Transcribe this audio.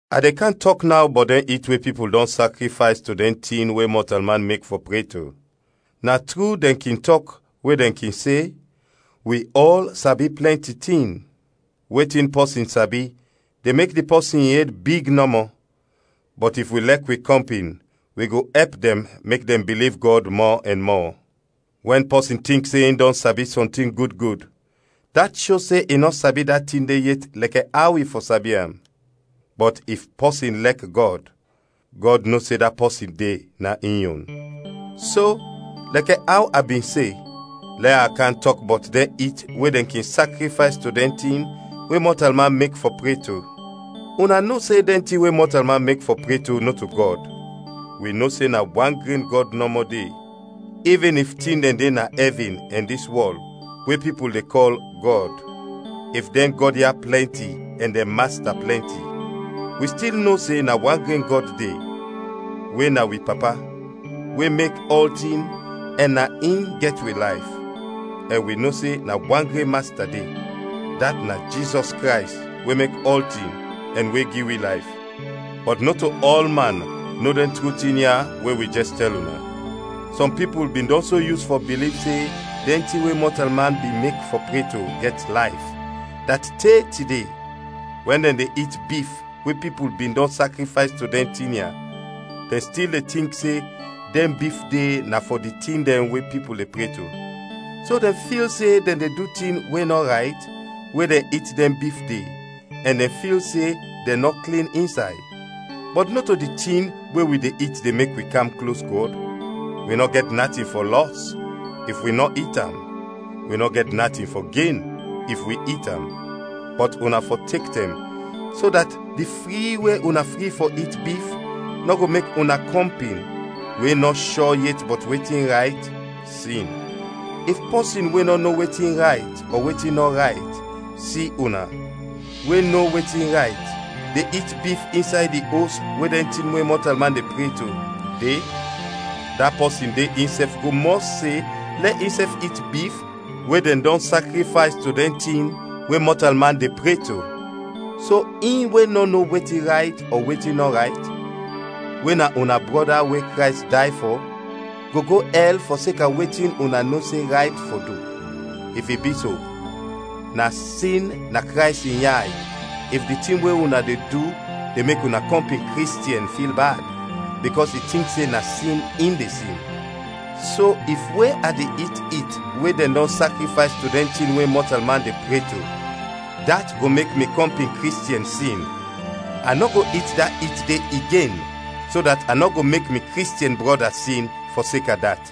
A de kam tɔk naw bɔt dɛn it we pipul dɔn sakrifays to dɛn tin we mɔtalman mek fɔ pre to. Na tru dɛn kin tɔk we dɛn kin se, “Wi ɔl sabi plɛnti tin.” Wetin pɔsin sabi de mek di pɔsin in ed big nɔmɔ, bɔt if wi lɛk wi kɔmpin wi go ɛp dɛn mek dɛn biliv Gɔd mɔ ɛn mɔ. Wɛn pɔsin tink se in dɔn sabi sɔntin gud gud, dat sho se i nɔ sabi da tin de yet lɛkɛ aw i fɔ sabi am. Bɔt if pɔsin lɛk Gɔd, Gɔd no se da pɔsin de na in yon. So, lɛkɛ aw a bin se, lɛ a kam tɔk bɔt dɛn it we dɛn kin sakrifays to dɛn tin we mɔtalman mek fɔ pre to: una no se dɛn tin we mɔtalman mek fɔ pre to nɔto Gɔd; wi no se na wan gren Gɔd nɔmɔ de. Ivin if tin dɛn de na ɛvin ɛn dis wɔl we pipul de kɔl “gɔd,” if dɛn gɔd ya plɛnti ɛn dɛn “masta” plɛnti, wi stil no se na wan gren Gɔd de, we na wi Papa, we mek ɔltin ɛn na in gɛt wi layf; ɛn wi no se na wan gren Masta de, dat na Jizɔs Krays we mek ɔltin, ɛn we gi wi layf. Bɔt nɔto ɔlman no dɛn tru tin ya we wi jɛs tɛl una. Sɔm pipul bin dɔn so yus fɔ biliv se dɛn tin we mɔtalman bin mek fɔ pre to gɛt layf, dat, te tide, wɛn dɛn de it bif we pipul bin dɔn sakrifays to dɛn tin ya, dɛn stil de tink se dɛn bif de na fɔ di tin dɛn we pipul de pre to. So dɛn fil se dɛn de du tin we nɔ rayt we dɛn it dɛn bif de ɛn dɛn fil se dɛn nɔ klin insay. Bɔt nɔto di tin we wi de it de mek wi kam klos Gɔd; wi nɔ gɛt natin fɔ lɔs if wi nɔ it am, wi nɔ gɛt natin fɔ gen if wi it am. Bɔt una fɔ tek tɛm so dat di fri we una fri fɔ it bif nɔ go mek una kɔmpin, we nɔ shɔ yet bɔt wetin rayt, sin. If pɔsin we nɔ no wetin rayt ɔ wetin nɔ rayt, si una, we no wetin rayt, de it bif insay di os we dɛn tin we mɔtalman de pre to, de, da pɔsin de insɛf go mɔs se lɛ insɛf it bif we dɛn dɔn sakrifays to dɛn tin we mɔtalman de pre to. So in we nɔ no wetin rayt ɔ wetin nɔ rayt, we na una brɔda we Krays day fɔ, go go ɛl fɔseka wetin una no se rayt fɔ du! If i bi so, na sin na Krays in yay if di tin we una de du de mek una kɔmpin Kristiɛn fil bad, bikɔs i tink se na sin in de sin. So if we a de it it we dɛn dɔn sakrifays to dɛn tin we mɔtalman de pre to, dat go mek mi kɔmpin Kristiɛn sin, a nɔ go it da it de igen so dat a nɔ go mek mi Kristiɛn brɔda sin, fɔseka dat.